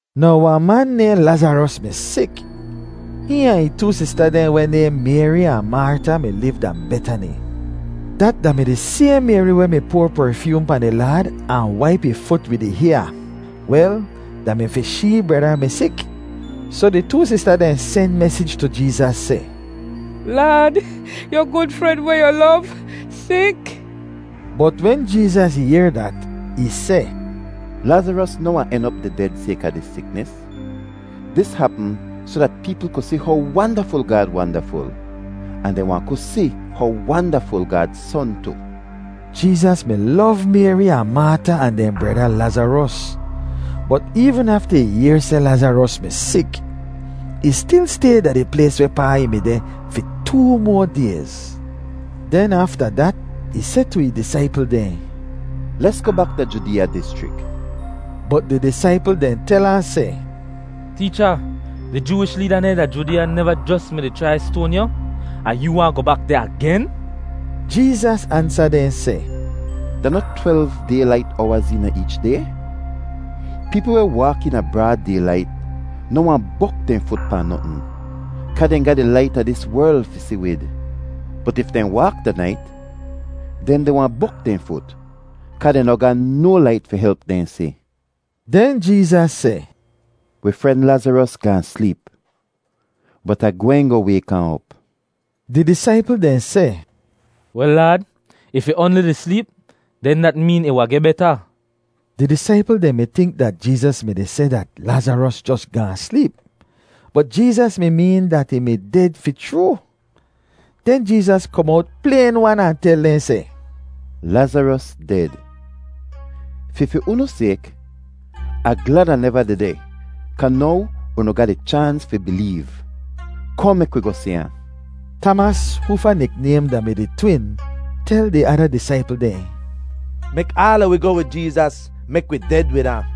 Now wahn man nayhn Lazaros mi sik. Hihn ahn ih too sista dehn weh nayhn Mayri ahn Marta mi liv da Betani. Dat da-mi di sayhn Mayri weh mi poar perfyoom pahn di Laad ahn waip ih fut wid ih hyaa. Wel, da-mi fi shee breda mi sik. Soh di too sista dehn sen mesij tu Jeezas seh, “Laad, yu gud fren weh yu lov sik.” Bot wen Jeezas yehr dat, ih seh, “Lazaros noh wahn en op di ded sayka dis siknis. Dis hapm soh dat peepl ku si how wandaful Gaad wandaful, ahn dehn wahn ku si how wandaful Gaad Son tu.” Jeezas mi lov Mayri ahn Marta ahn dehn breda Lazaros, bot eevn afta ih yehr seh Lazaros mi sik, ih stil stay da di plays wehpaa ih mi deh fi too moa dayz. Den afta dat, ih seh tu ih disaipl dehn, “Lesgoh bak da Judeeya dischrik.” Bot di disaipl dehn tel ahn seh, “Teecha, di Jooish leeda dehn da Judeeya neva jos mi-di chrai stoan yu, ahn yoo waahn goh bak deh agen?” Jeezas ansa dehn seh, “Da noh twelv daylait owaz eena eech day? Peepl weh waak eena braad daylait noh wahn bok dehn fut pahn notn, kaa dehn ga di lait a dis werl fi si wid. Bot if dehn waak da nait, den dehn wahn bok dehn fut, kaa dehn noh ga no lait fi help dehn si.” Den Jeezas seh, “Wi fren Lazaros gaahn sleep, bot Ah gwehn goh wayk ahn op.” Di disaipl dehn seh, “Wel Laad, if ih oanli di sleep, den dat meen ih wahn geh beta.” Di disaipl dehn mi tink dat Jeezas mi-di seh dat Lazaros jos gaahn sleep, bot Jeezas mi meen dat ih mi ded fi chroo. Den Jeezas kom owt playn-wan ahn tel dehn seh, “Lazaros ded. Fi fi unu sayk, Ah glad Ah neva dehdeh kaa now unu ga di chaans fi bileev. Kohn, mek wi goh si ahn.” Tamas, hoofa niknaym da-mi di Twin, tel di ada disaipl dehn, “Mek aala wi goh wid Jeezas mek wi ded wid ahn.”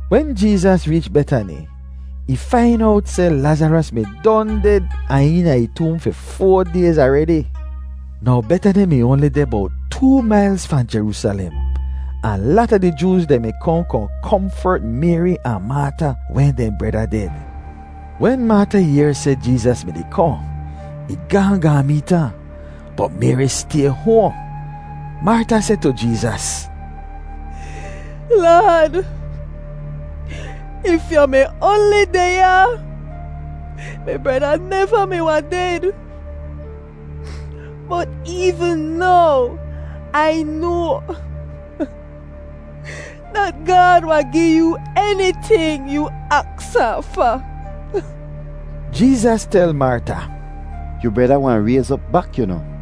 Wen Jeezas reech Betani, ih fain owt seh Lazaros mi don ded ahn eena ih toom fi foa dayz aredi. Now Betani mi oanli deh bowt too mailz fahn Jeroosalem, ahn lata di Jooz dehn mi kohn kohn komfert Mayri ahn Marta wen dehn breda ded. Wen Marta yehr seh Jeezas mi-di kohn, ih gaahn gaahn meet ahn, bot Mayri stay hoahn. Marta seh tu Jeezas, “Laad, if yu mi oanli deh ya, mi breda neva mi wahn ded. Bot eevn now Ai noa dat Gaad wahn gi yoo eniting yoo aks ahn fa.” Jeezas tel Marta, “Yu breda wahn rayz op bak, yu noh.”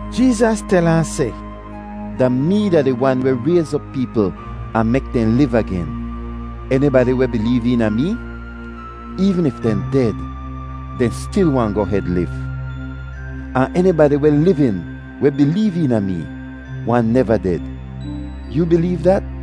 Jeezas tel ahn seh, “Da mee da di Wan weh rayz op peepl ahn mek dehn liv agen. Enibadi weh bileev eena mee, eevn if dehn ded, dehn stil wahn goh hed liv, ahn enibadi weh livin weh bileev eena mee wahn neva ded. Yoo bileev dat?”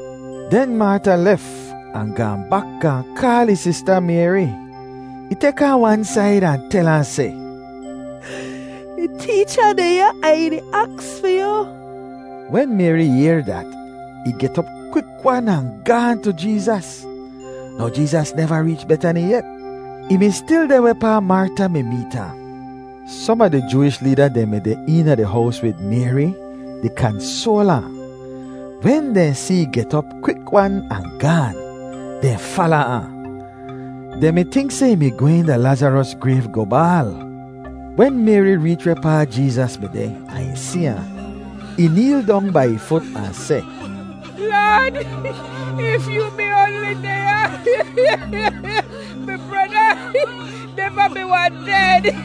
Den Marta lef, ahn gaahn bak gaahn kaal ih sista Mayri. Ih tek ahn wan said ahn tel ahn seh, “Di Teecha deh ya ahn ih di aks fi yu.” Wen Mayri yehr dat, ih get op kwik-wan ahn gaahn tu Jeezas. Now Jeezas neva reech Betani yet. Ih mi stil deh wehpaa Marta mi meet ahn. Som a di Jooish leeda dehn mi deh eena di hows wid Mayri di kansoal ahn. Wen dehn si ih get op kwik-wan ahn gaan, dehn fala ahn. Dehn mi tink seh ih mi gwehn da Lazaros grayv goh baal. Wen Mayri reech wehpaa Jeezas mi deh ahn ih si ahn, ih neel dong bai ih fut ahn seh, “Laad, if yoo mi oanli deh ya, mi breda neva mi wahn ded.”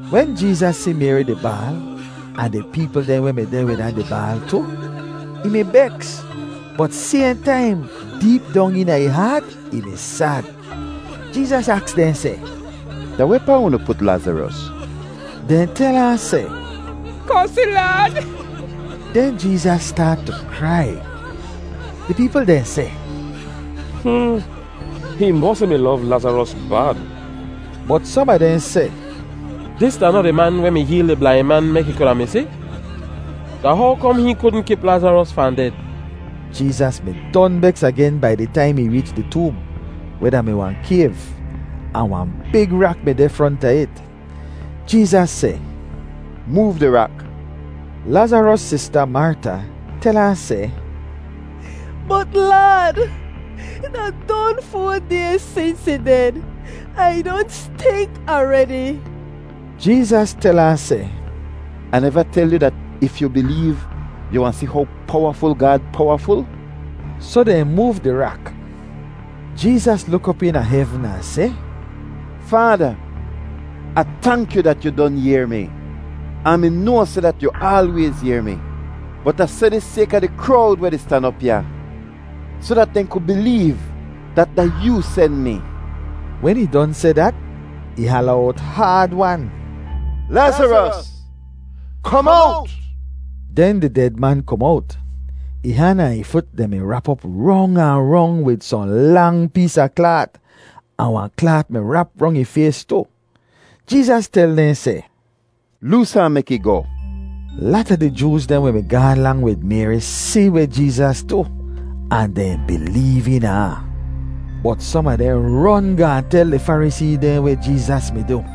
Wen Jeezas si Mayri di baal, ahn di peepl dehn weh mi deh wid ahn di baal tu, ih mi beks, bot sayhn taim, deep dong eena ih haat ih mi sad. Jeezas aks dehn seh, “Da wehpaa unu put Lazaros?” Dehn tel ahn seh, “Kohn si, Laad.” Den Jeezas staat tu krai. Di peepl dehn seh, “Hmm, hihn mosi mi lov Lazaros bad!” Bot som a dehn seh, “Dis da noh di man weh mi heel di blain man mek ih kuda mi si? Da how kom hihn kudn kip Lazaros fahn ded?” Jeezas mi don beks agen bai di taim ih reech di toom, weh da-mi wahn kayv, ahn wahn big rak mi deh fronta it. Jeezas seh, “Moov di rak.” Lazaros sista, Marta, tel ahn seh, “Bot Laad, da don foa dayz sins ih ded ahn ih don stink aredi.” Jeezas tel ahn seh, “Ah neva tel yu dat if yu bileev, yu wahn si how powaful Gaad powaful?” Soh dehn moov di rak. Jeezas luk op eena hevn ahn seh, “Faada, Ah tank yu dat yu don yehr mi. Ah mi noa seh dat yu aalwayz yehr mi, bot Ah seh dis sayka di krowd weh di stan op ya, soh dat dehn ku bileev dat da yoo sen mi.” Wen ih don seh dat, ih hala owt haad-wan, “Lazaros, kom owt!” Den di ded man kom owt. Ih han ahn ih fut dehn mi rap op rong ahn rong wid sohn lang pees a klaat, ahn wahn klaat mi rap rong ih fays tu. Jeezas tel dehn seh, “Loos ahn mek ih goh.” Lata di Jooz dehn weh mi gaahn lang wid Mayri si weh Jeezas du ahn dehn bileev eena ahn. Bot som a dehn ron gaahn tel di Farisee dehn weh Jeezas mi du.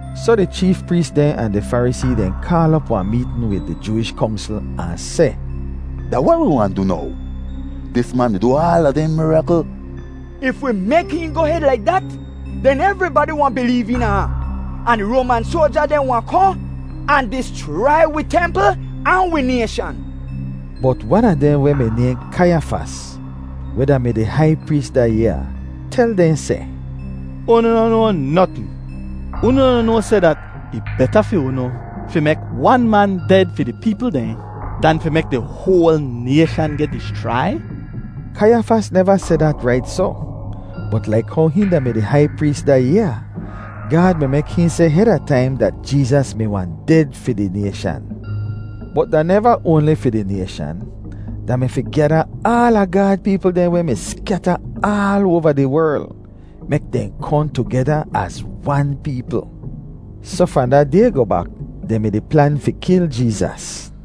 Soh di cheef prees dehn ahn di Farisee dehn kaal op wahn meetn wid di Jooish Kongsl ahn seh, “Da weh wi wahn du now? Dis man di du aala dehn mirakl. If wi mek hihn goh hed laik dat, den evribadi wahn bileev eena ahn, ahn di Roaman soalja dehn wahn kohn ahn dischrai wi templ ahn wi nayshan.” Bot wan a dehn weh mi nayhn Kaiyafas, weh da-mi di hai prees da yaa, tel dehn seh, “Unu noh noa notn! Unu noh noa seh dat ih beta fi unu fi mek wan man ded fi di peepl dehn dan fi mek di hoal nayshan geh dischrai?” Kaiyafas neva seh dat rait soh, bot laik how hihn da-mi di hai prees da yaa, Gaad mi mek hihn seh heda taim dat Jeezas mi wahn ded fi di nayshan. Bot da neva oanli fi di nayshan; da mi fi gyada aala Gaad peepl dehn weh mi skyata aal oava di werl, mek dehn kohn tugeda az wan peepl. Soh fahn da day goh bak, dehn mi-di plan fi kil Jeezas.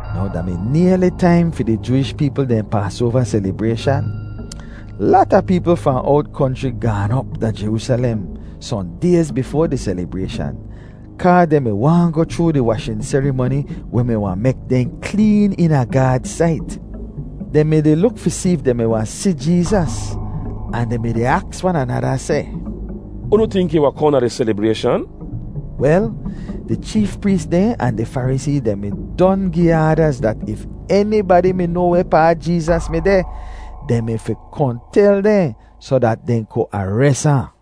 Now da mi nayli taim fi di Jooish peepl dehn Paasoava selibrayshan. Lata peepl fahn owt konchri gaan op da Jeroosalem sohn dayz bifoa di selibrayshan, kaa dehn mi waahn goh chroo di washin serimoni weh mi wahn mek dehn kleen eena Gaad sait. Dehn mi-di luk fi si if dehn mi wahn si Jeezas ahn dehn mi-di aks wan anada seh, “Unu tink ih wahn kohn da di selibrayshan?” Wel, di cheef prees dehn ahn di Farisee dehn mi don gi aadaz dat if enibadi mi noa wehpaa Jeezas mi deh, dehn mi fi kohn tel dehn soh dat dehn ku ares ahn.